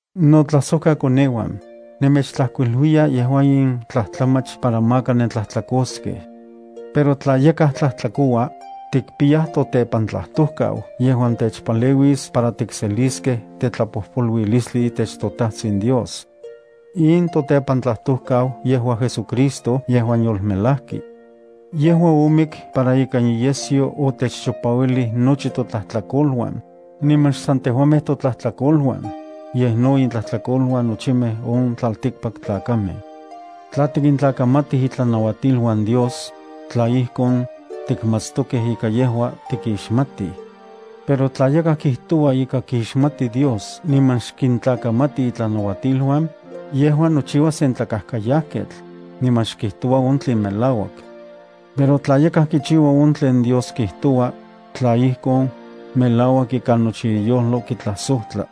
Notlajsojkakoneuan, nemechtlajkuiluiya yejua in tlajtlamach para maka nentlajtlakoskej. Pero tla yakaj tlajtlakoua, tikpiyaj totepantlajtojkau yejuan techpaleuis para tikseliskej tetlapojpoluilistli itech toTajtsin Dios. In totepantlajtojkau yejua JesuCristo yejuan yolmelajki. Yejua omik para ikan iyesyo otechchipauilij nochi totlajtlakoluan, niman xsan tejuamej totlajtlakoluan, yej no intlajtlakoluan nochimej on tlaltikpaktlakamej. Tla tikintlakamatij itlanauatiluan Dios, tla ijkon, tikmatstokej ika yejua tikixmatij. Pero tla yakaj kijtoua ika kixmati Dios niman xkintlakamati itlanauatiluan, yejua nochiua sen tlakajkayajketl, niman xkijtoua on tlen melauak. Pero tla yakaj kichiua on tlen Dios kijtoua, tla ijkon, melauak ikan nochi iyojlo kitlajsojtla.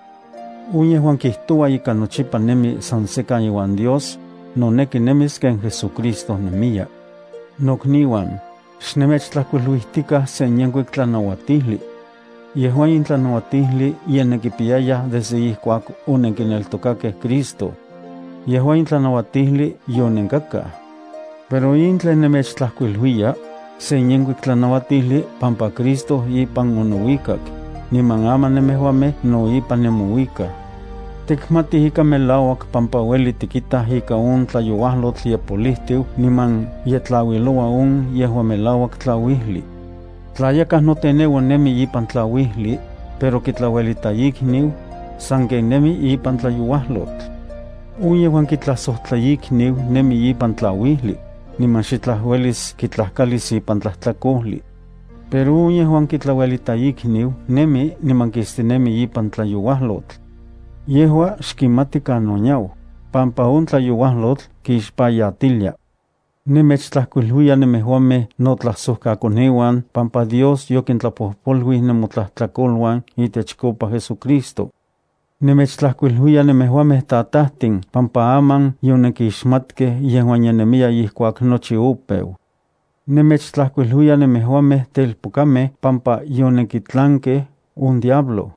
On yejuan kijtoua ika nochipa nemi san sekan iuan Dios, noneki nemis ken JesuCristo nemiya. Nokniuan, xnemechtlajkuiluijtikaj se yenkuik tlanauatijli. Yejua in tlanauatijli ye nenkipiyayaj desde ijkuak onenkineltokakej Cristo. Yejua in tlanauatijli yonenkakaj. Pero in tlen nemechtlajkuiluiya, sen yenkuik tlanauatijli pampa Cristo ipan onouikak, niman aman nemejuamej no ipan nemouikaj. Tikmatij ika melauak pampa ueli tikitaj ika on tlayouajlotl ye polijtiu niman ye tlauiloua on yejuan melauak tlauijli. Tla yakaj noteneua nemi ipan tlauijli, pero kitlauelita ikniu, sanken nemi ipan tlayouajlotl. On yejuan kitlajsojtla ikniu nemi ipan tlauijli, niman xitlaj uelis kitlajkalis ipan tlajtlakojli. Pero on yejuan kitlauelita ikniu nemi niman kistinemi ipan tlayouajlotl. Yejua xkimati kanon yau, pampa on tlayoualyotl kixpayatilia. Nemechtlajkuiluiya nemejuamej notlajsojkakoneuan pampa Dios yokintlapojpoluij nemotlajtlakoluan itechkopa JesuCristo. Nemechtlajkuiluiya nemejuamej tatajtin pampa aman yonenkixmatkej yejuan ye nemiya ijkuak nochi opeu. Nemechtlajkuiluiya nemejuamej telpokamej pampa yonenkitlankej on diablo.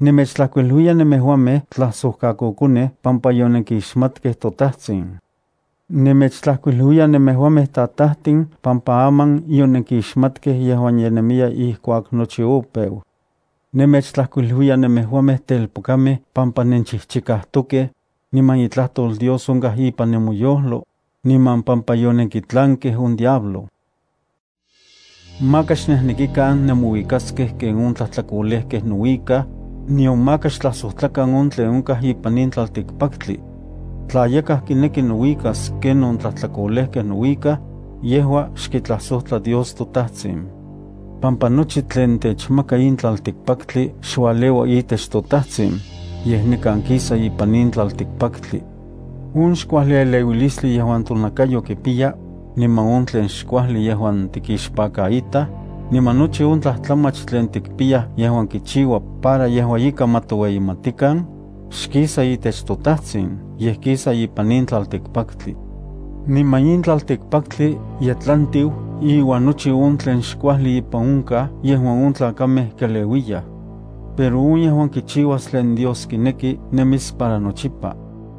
Nemechtlajkuiluiya nemejuamej tlajsojkakokonej pampa yonenkixmatkej toTajtsin. Nemechtlajkuiluiya nemejuamej tatajtin pampa aman yonenkixmatkej yejuan ye nemiya ijkuak nochi opeu. Nemechtlajkuiluiya nemejuamej telpokamej pampa nenchijchikajtokej, niman itlajtol Dios onkaj ipan nemoyojlo, niman pampa yonenkitlankej on diablo. Maka xnejnekikan nemouikaskej ken on tlajtlakolejkej nouikaj, nion maka xtlajsojtlakan on tlen onkaj ipan in tlaltikpaktli. Tla yakaj kineki nouikas ken on tlajtlakolejkej nouikaj, yejua xkitlajsojtla Dios toTajtsin, pampa nochi tlen techmaka in tlaltikpaktli xualeua itech toTajtsin, yej nikan kisa ipan in tlaltikpaktli. On xkuajli eleuilistli yejuan tonakayo kipiya, niman on tlen xkuajli yejuan tikixpakaitaj, niman nochi on tlajtlamach tlen tikpiyaj yejuan kichiua para yejua ika ma titoueyimatikan, xkisa itech toTajtsin, yej kisa ipan in tlaltikpaktli. Niman in tlaltikpaktli ye tlantiu iuan nochi on tlen xkuajli ipan onkaj yejuan on tlakamej keleuiyaj. Pero on yejuan kichiuas tlen Dios kineki nemis para nochipa.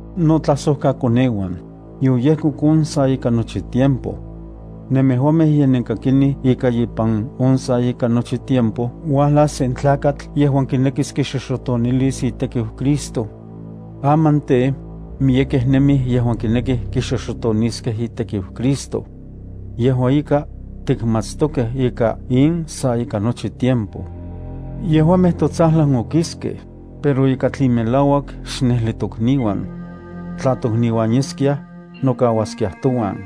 Notlajsojkakoneuan, yoyejkok on sa ika nochi tiempo. Nemejuamej ye nenkakinij ika ipan on sa ika nochi tiempo uajlas sen tlakatl yejuan kinekiskixoxotonilis itekiu Cristo. Aman tej, miyekej nemij yejuan kinekij kixoxotoniskej itekiu Cristo. Yejua ika, tikmatstokej ika in sa ika nochi tiempo. Yejuamej totsajlan okiskej, pero ika tlen melauak xnejli tokniuan. Tla tokniuan yeskiaj, nokauaskiaj touan.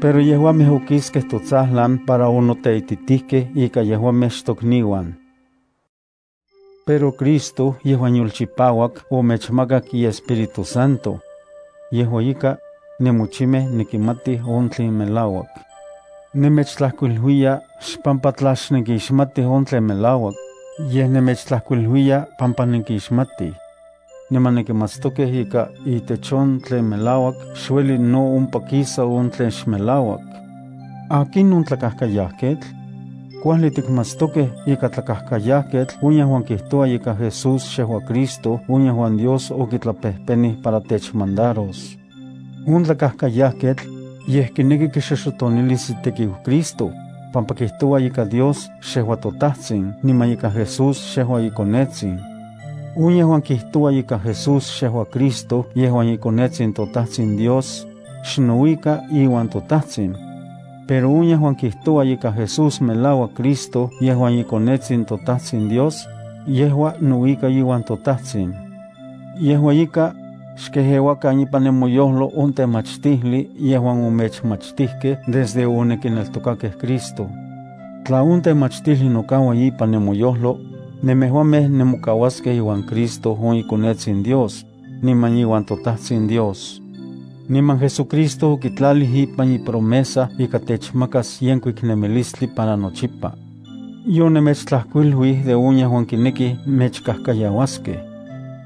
Pero yejuamej okiskej totsajlan para onoteititijkej ika yejuamej xtokniuan. Pero Cristo yejuan yolchipauak omechmakak iEspíritu Santo. Yejua ika, nenmochimej nenkimatij on tlen melauak. Nemechtlajkuiluiya xpampa tla xnenkixmatij on tlen melauak, yej nemechtlajkuiluiya pampa nenkixmatij. Niman nenkimatstokej ika itech on tlen melauak xueli no ompa kisa on tlen xmelauak. ¿Akinon tlakajkayajketl? Kuajli tikmatstokej ika tlakajkayajketl on yejuan kijtoua ika Jesús xejua Cristo on yejuan Dios okitlapejpenij para techmandaros. On tlakajkayajketl, yej kineki kixoxotonilis itekiu Cristo, pampa kijtoua ika Dios xejua toTajtsin niman ika Jesús xejua iKonetsin. On yejuan kijtoua ika Jesús xejua Cristo yejuan iKonetsin toTajtsin Dios, xnouika iuan toTajtsin. Pero on yejuan kijtoua ika Jesús melauak Cristo yejuan iKonetsin toTajtsin Dios, yejua nouika iuan toTajtsin. Yejua ika, xkejeuakan ipan nemoyojlo on temachtijli yejuan omechmachtijkej desde onenkineltokakej Cristo. Tla on temachtijli nokaua ipan nemoyojlo, nemejuamej nemokauaskej iuan Cristo on iKonetsin Dios, niman iuan toTajtsin Dios. Niman JesuCristo okitlalij ipan ipromesa ika techmakas yenkuik nemilistli para nochipa. Yonemechtlajkuiluij de on yejuan kinekij mechkajkayauaskej.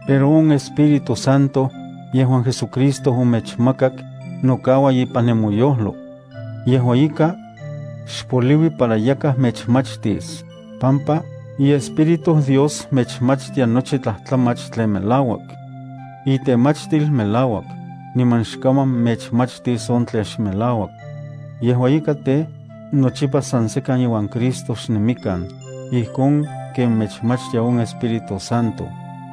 Pero on Espíritu Santo, yejuan JesuCristo omechmakak, nokaua ipan nemoyojlo. Yejua ika, xpoliui para yakaj mechmachtis, pampa iEspíritu Dios mechmachtia nochi tlajtlamach tlen melauak. Itemachtil melauak, niman xkaman mechmachtis on tlen xmelauak. Yejua ika tej, nochipa san sekan iuan Cristo xnemikan, ijkon ken mechmachtia on Espíritu Santo.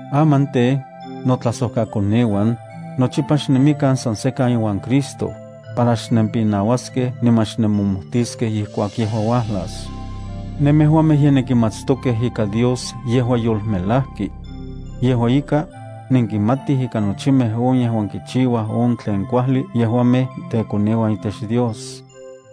Aman tej, notlajsojkakoneuan, nochipa xnemikan san sekan iuan Cristo, para xnempinauaskej niman xnenmojmotiskej ijkuak yejua uajlas. Nemejuamej ye nenkimatstokej ika Dios yejua yolmelajki. Yejua ika, nenkimatij ika nochimej on yejuan kichiuaj on tlen kuajli yejuamej tekoneuan itech Dios.